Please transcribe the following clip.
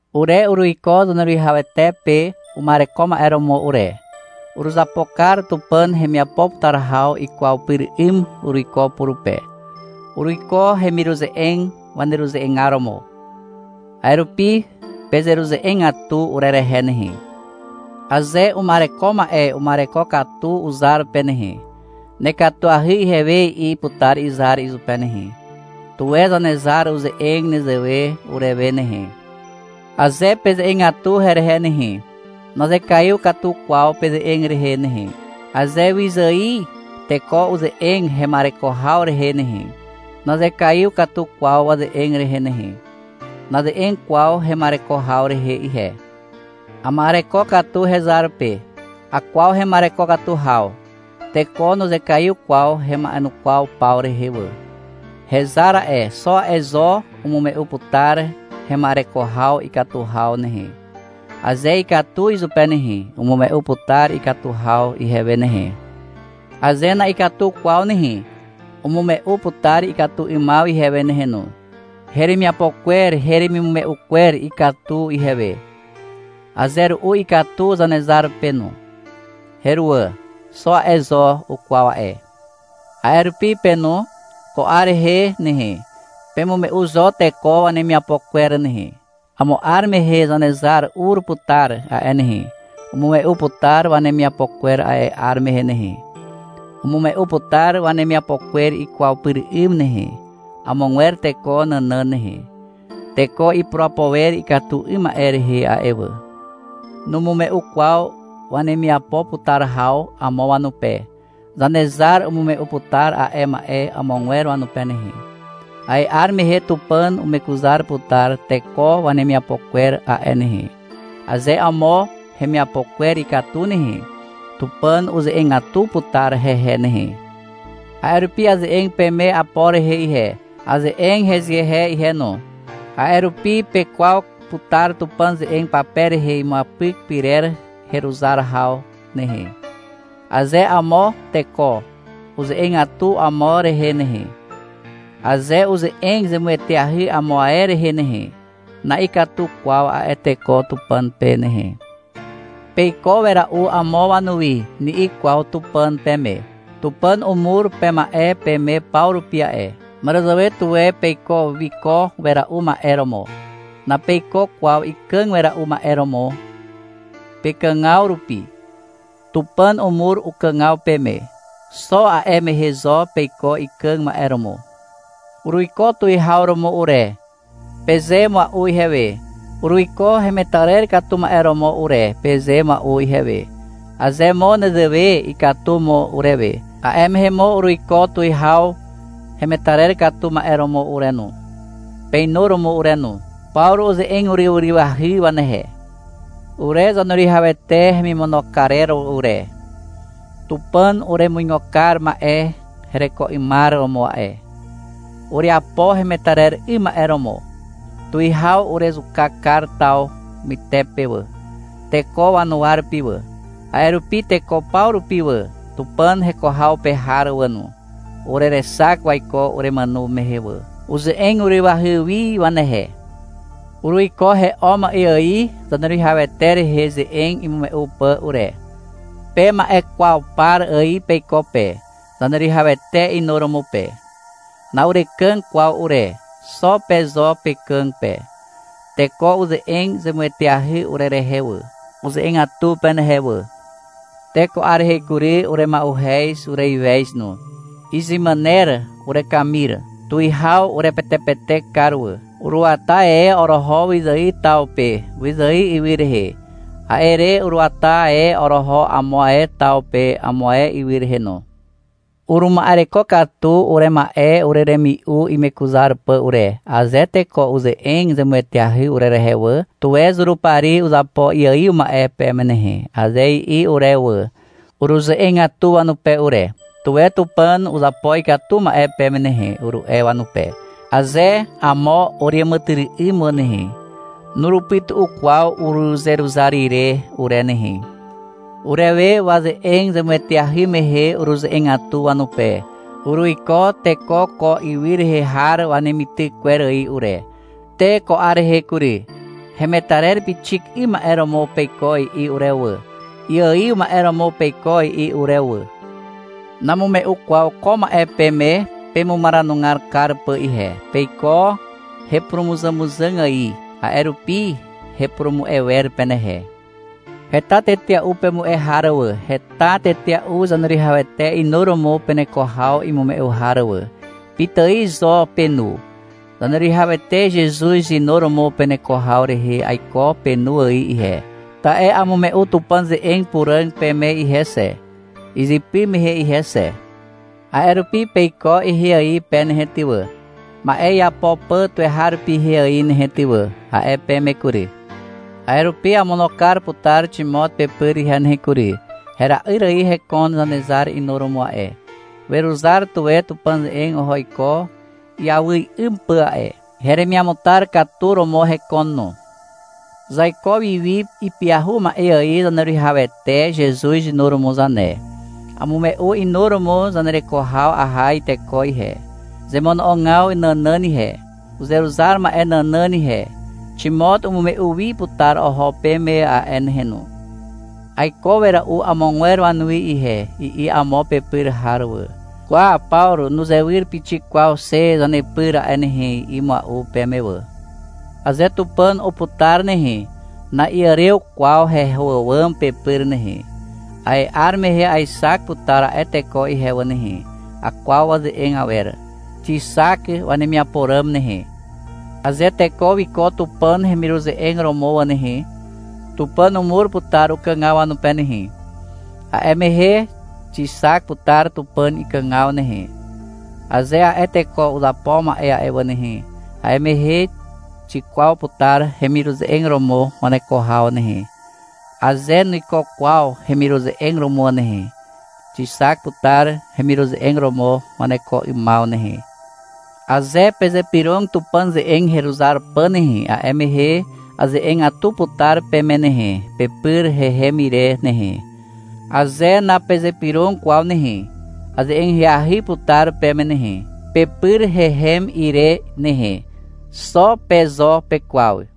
Ure uruiko Zaneruwihawete pe uma'ereko ma'e romo ure. Uruzapo kar Tupàn hemiapo putar haw ikwaw pyr 'ym uruiko purupe. Uruiko hemiruze'eg waneruze'egar romo. A'e rupi pezeruze'egatu urerehe nehe. Aze uma'ereko ma'e uma'ereko katu uzar pe nehe, — Nekatuahy ihewe, i'i putar izar izupe nehe. Tuwe Zanezar uze'eg nezewe urewe nehe. Aze peze'egatu herehe nehe, nazekaiw katu kwaw peze'eg rehe nehe. Aze wyzài teko uze'eg hema'ereko haw rehe nehe, nazekaiw katu kwaw waze'eg rehe nehe. Naze'eg kwaw hema'ereko haw rehe ihe. Ama'ereko katu hezar pe. Akwaw hema'ereko katu haw. Teko nuzekaiw kwaw hema'enukwaw paw rehe wà. Hezar a'e, xo a'e zo umume'u putar hema'ereko haw ikatu haw nehe. Aze ikatu izupe nehe, umume'u putar ikatu haw ihewe nehe. Aze na'ikatu kwaw nehe, umume'u putar ikatu 'ymaw ihewe nehe no. Heremiapo kwer heremimume'u kwer ikatu ihewe. Aze ru'u ikatu Zanezar pe no. Heruwà. Xo a'e zo ukwaw a'e. A'e rupi pe no. Ko 'ar rehe nehe, pemume'u zo teko wanemiapo kwer nehe. Amo 'ar mehe Zanezar ur putar a'e nehe. Umume'u putar wanemiapo kwer a'e 'ar mehe nehe. Umume'u putar wanemiapo kwer ikwaw pyr 'ym nehe, amogwer teko nànàn nehe. Teko ipurapo wer ikatu 'ym ma'e rehe a'e wà. Numume'u kwaw wemiapo putar haw amo wanupe. Zanezar umume'u putar a'e ma'e amogwer wanupe nehe. A'e 'ar mehe Tupàn umekuzar putar teko wanemiapo kwer a'e nehe. Aze amo hemiapo kwer ikatu nehe, Tupàn uze'egatu putar hehe nehe. A'e rupi aze'eg peme Apor rehe ihe, aze'eg hezehe ihe no. A'e rupi pekwaw putar Tupàn ze'eg pape rehe imuapyk pyrer heruzar haw nehe. Aze amo teko uze'egatu amo rehe nehe, aze uze'eg zemueteahy amo ae rehe nehe, na'ikatu kwaw a'e teko Tupàn pe nehe. — Peiko wera'u amo wanuwi, ni'i kwaw Tupàn peme. Tupàn umur pema'e peme paw rupi a'e. Màràzàwe tuwe peiko wiko wera'u ma'e romo. Napeiko kwaw ikàg wera'u ma'e romo pekàgaw rupi. Tupàn umur ukàgaw peme. Xo a'e mehe zo peiko ikàg ma'e romo. — Uruiko tuwihaw romo ure, peze mua'u ihewe. Uruiko hemetarer katu ma'e romo ure, peze mua'u ihewe. Aze mo nezewe, ikatu mo urewe. A'e mehe mo uruiko tuwihaw hemetarer katu ma'e romo ure no, peinuromo ure no. (Pawru uze'eg uryw ahyahy wanehe.) Ure Zaneruwihawete hemimono karer ure. Tupàn uremuigo kar ma'e hereko 'ymar romo a'e. Ureapo hemetarer 'ym ma'e romo. Tuwihaw urezuka kar taw mytepe wà, teko wanuwa rupi wà. A'e rupi teko paw rupi wà, Tupàn heko haw pe har wà no, urerexak waiko uremàno mehe wà. (Uze'eg urywahy wi wanehe.) Uruiko he'o ma'e ài Zaneruwihawete rehe ze'eg imume'u pà ure. Pe ma'e kwaw par ài peiko pe, Zaneruwihawete inuromo pe. Na'urekàg kwaw ure, xo pe zo pekàg pe. Teko uze'eg zemueteahy urerehe wà. Uze'egatu penehe wà. te ko 'ar rehe kury, urema'uhez, ureiwez no. Izemàner urekamir. Tuwihaw urepetepetek kar wà. Uruata e oroho wyzài taw pe, wyzài ywy rehe. A'e re uruata e oroho amo ae taw pe amo ae ywy rehe no. Uruma'ereko katu urema'e ureremi'u imekuzar pà ure. Aze teko uze'eg zemueteahy urerehe wà, — Tuwe Zurupari uzapo iaiw ma'e peme nehe, aze i'i urewe wà, uruze'egatu wanupe ure. — Tuwe Tupàn uzapo ikatu ma'e peme nehe, uru'e wanupe. Aze amo ureàmàtyry'ym wà nehe, nurupytu'u kwaw uruzeruzar ire ure nehe. Urewe waze'eg zemueteahy mehe uruze'egatu wanupe. Uruiko teko ko ywy rehe har wanemityk kwer ài ure. Te ko 'ar rehe kury, — Hemetarer pixik 'ym ma'e romo peiko, i'i urewe wà. — Iaiw ma'e romo peiko, i'i urewe wà. Namume'u kwaw ko ma'e peme pemumaranugar kar pà ihe. Peiko hepurumuzàmuzàg ài, a'e rupi hepurumu'e wer penehe. Heta tetea'u pemu'e har wà, heta tetea'u Zaneruwihawete inuromo peneko haw imume'u har wà. Pitài zo penu. Zaneruwihawete Zezuz inuromo peneko haw rehe aiko penu ài ihe, ta'e amume'u Tupàn ze'eg puràg peme ihe xe, izypy mehe ihe xe. A'e rupi, — Peiko ihe ài pe nehe ty wà, ma'e iapo pà tuweharupi ihe ài nehe ty wà, a'e peme kury. A'e rupi amono kar putar Ximot pepyr ihe nehe kury. Hera'yr ài hekon Zanezar inuromo a'e. Weruzar tuwe Tupàn ze'eg oho iko iawy 'ym pà a'e. Heremiamutar katu romo hekon no. Zaiko wiwi ipyahu ma'e ài Zaneruwihawete Zezuz inuromo zane. Amume'u inuromo zanereko haw aha iteko ihe, zemono'ogaw nànàn ihe, uzeruzar ma'e nànàn ihe. Ximot umume'u wi putar oho peme a'e nehe no. — Aiko wera'u amogwer wanuwi ihe, i'i amo pepyr har wà. — Kwa, Pawru nuzewyr pixik kwaw xe zanepyr a'e nehe, i'i mua'u peme wà. Aze Tupàn uputar nehe, na'iàrew kwaw heho àwàm pepyr nehe. A'e 'ar mehe aexak putar a'e teko ihe wà nehe. Akwaw waze'eg awer. Xixak wanemiapo ràm nehe. Aze teko wiko Tupàn hemiruze'eg romo wà nehe, Tupàn umur putar ukàgaw wanupe nehe. A'e mehe xixak putar Tupàn ikàgaw nehe, aze a'e teko uzapo ma'e a'e wà nehe. A'e mehe xikwaw putar hemiruze'eg romo waneko haw nehe. Aze nuiko kwaw hemiruze'eg romo nehe, xixak putar hemiruze'eg romo waneko 'ymaw nehe. Aze pezypyrog Tupàn ze'eg heruzar pà nehe, a'e mehe aze'egatu putar peme nehe, pepyr hehem ire nehe. Aze napezypyrog kwaw nehe, aze'eg ahyahy putar peme nehe, pepyr hehem ire nehe. Xo pe zo pekwaw.